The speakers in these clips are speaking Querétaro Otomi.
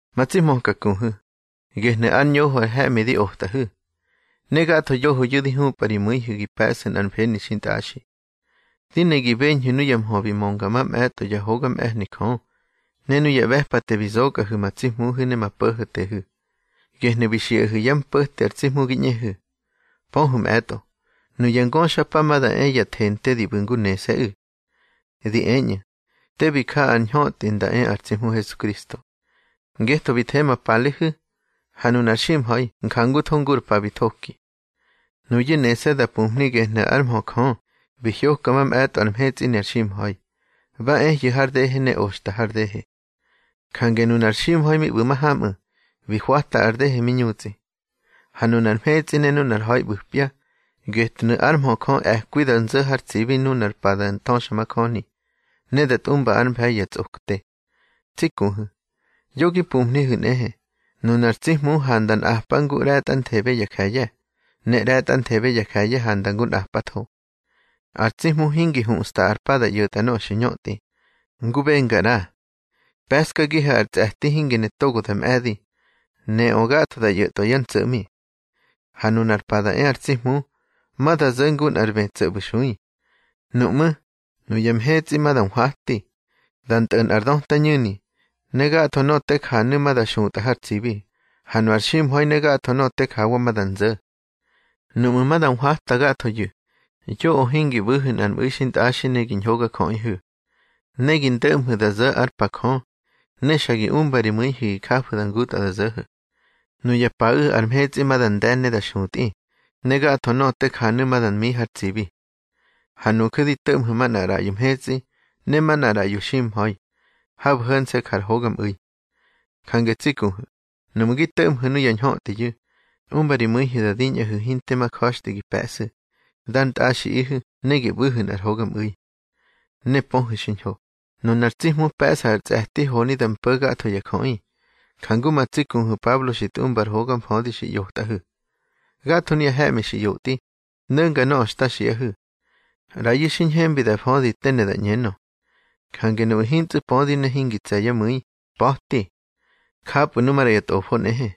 Ma tsi hmöka kuhu̱, gehnu̱ ár ñoho ar he̱ꞌmi di otꞌahu̱, ne gatho yohoyu̱ di hupꞌa ri mu̱ihu̱ gi pe̱ꞌsu̱ nꞌar mfeni xintꞌaxi. Di ne gi beñhu̱ nuya mhö bi mönga mamꞌe̱tꞌo yá hoga mꞌe̱hni Jö, ne nuya ꞌbe̱pate bi zokꞌahu̱ ma tsi Hmuhu̱ ne ma Po̱ho̱tehu̱, gehnu̱ bi xiꞌahu̱ yá mpo̱te ar tsi Hmu gi ꞌñehu̱. Pöhu̱ mꞌe̱tꞌo, nuya ngöxapa ma da e ya thente di ꞌbu̱ ngu nese̱ꞌu̱. Di eñꞌu̱: Te bi ja ar ñhötꞌi nda e ar tsi Hmu Hesukristo. Ngetho bi the ma palehu̱, ha nunar ximha̱i njangutho ngu ar pa bi thoki. Nuyu̱ nese̱ da pumhni gehnu̱ ár mhö Jö bi hyoka mamꞌe̱tꞌo ar mhetsꞌi ne ar ximha̱i. Ba ehyu̱ har dehe ne oxta har dehe. Jange nunar ximha̱i mi ꞌbu̱ mahamꞌu̱, bi hwata ar dehe mi ñutsꞌi. Ha nunar mhetsꞌi ne nunar ha̱i ꞌbu̱pya, getnu̱ ár mhö Jö e̱kwi da nzo̱ har tsibi nunar pa da thöxamajöni, ne da tꞌumba ár mfe̱i ya tsꞌokte. Tsi kuhu̱, yo gi pumhnihu̱ nꞌehe, nunar tsi Hmu handa nꞌapa ngu ꞌre̱tꞌanthebe ya je̱ye̱, ne ꞌre̱tꞌanthebe ya je̱ye̱ handa ngu nꞌapatho. Ar tsi Hmu hingi huꞌsta ar pa da ꞌyo̱tꞌa nöꞌö xi ñötꞌi, ngu benga ꞌra. Pe̱ꞌskagihu̱ ar tsꞌe̱ti hingi ne togo da mꞌe̱di, neꞌö gatho da ꞌyo̱tꞌwa yá ntso̱ꞌmi. Ha nunar pa da e ar tsi Hmu, ma da zo̱ ngu nꞌar bë tso̱ ꞌbu̱ nxui. Nuꞌmú̱, nuya mhetsꞌi ma da nhwati, da ntꞌo̱ nꞌar döta ñu̱ni, ne gatho nöꞌö te janu̱ ma da xutꞌa har tsibi, ha nu ar ximha̱i ne gatho nöꞌö te jawa ma da nzo̱. Nuꞌmu̱ ma da nhwata gathoyu̱, yoꞌö hingi ꞌbu̱hu̱ nꞌar mꞌu̱i xintꞌaxi ne gi ñhogajöꞌihu̱. Ne gi ndo̱ꞌmhu̱ da zo̱ ár pa Jö, ne xa gi umba ri mu̱ihu̱ gi jafu̱ ngutꞌa da zo̱ho̱. Nuya paꞌu̱ ar mhetsꞌi ma da nde̱ ne da xutꞌi, ne gatho nöꞌö te janu̱ ma da mi har tsibi. Ha nuju̱ di to̱ꞌmhu̱ manꞌar ꞌraꞌyo mhetsꞌi ne manꞌar ꞌraꞌyo ximha̱i, habu̱ ho̱nse̱ ja ar hogamꞌu̱i. Jange tsi kuhu̱, nuꞌmu̱ gi to̱ꞌmhu̱ nuya ñhötꞌiyu̱, umba ri mu̱ihu̱ da diñꞌahu̱ hinte ma ja̱xtꞌi gi pe̱ꞌsu̱, dar ntꞌaxiꞌihu̱ ne gi ꞌbu̱hu̱ nꞌar hogamꞌu̱i. Ne pöhu̱ xiñho, nunar tsi Hmu pe̱ꞌsa ar tsꞌe̱ti honi da mpo̱ gatho ya jöꞌi, jangu ma tsi kuhu̱ Pablo xi tꞌumba ar hoga mfödi xi ꞌyotꞌahu̱. Gatho nuya he̱ꞌmi xi ꞌyotꞌi, no̱nga nöꞌö xta xiꞌahu̱. ꞌRayu̱ xi ñhembi da födi te ne da ꞌñenö. Jange nuꞌu̱ hintsꞌu̱ pödi ne hingi tse̱ yá mu̱i, pa̱ti. Japꞌu̱ nu maꞌra ya Tꞌofo nꞌehe,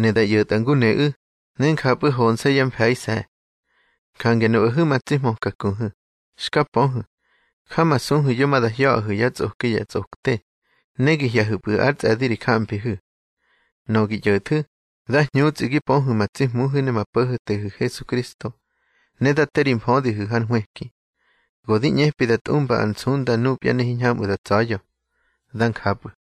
ne da ꞌyo̱tꞌa ngu neꞌu̱, ne njapꞌu̱ honse̱ yá mfe̱ise̱. Jange nuꞌahu̱ ma tsi hmöka kuhu̱, xka pöhu̱, jamasuhu̱ yo ma da hya̱ꞌahu̱ yá tsꞌoki ya tsꞌokte, ne gi hye̱hu̱pꞌu̱ ár tsꞌe̱di ri jamfihu̱. Nöꞌö gi ꞌyo̱thu̱, dá hñutsꞌi gi pöhu̱ ma tsi Hmuhu̱ ne ma Po̱ho̱tehu̱ Hesukristo, ne dá te ri mfödihu̱ hár nhwëki. Go di ꞌñepꞌu̱ da tꞌumba ar nsunda nupya ne hiñhamꞌu̱ da ntsa̱ya̱. Dá njapꞌu̱.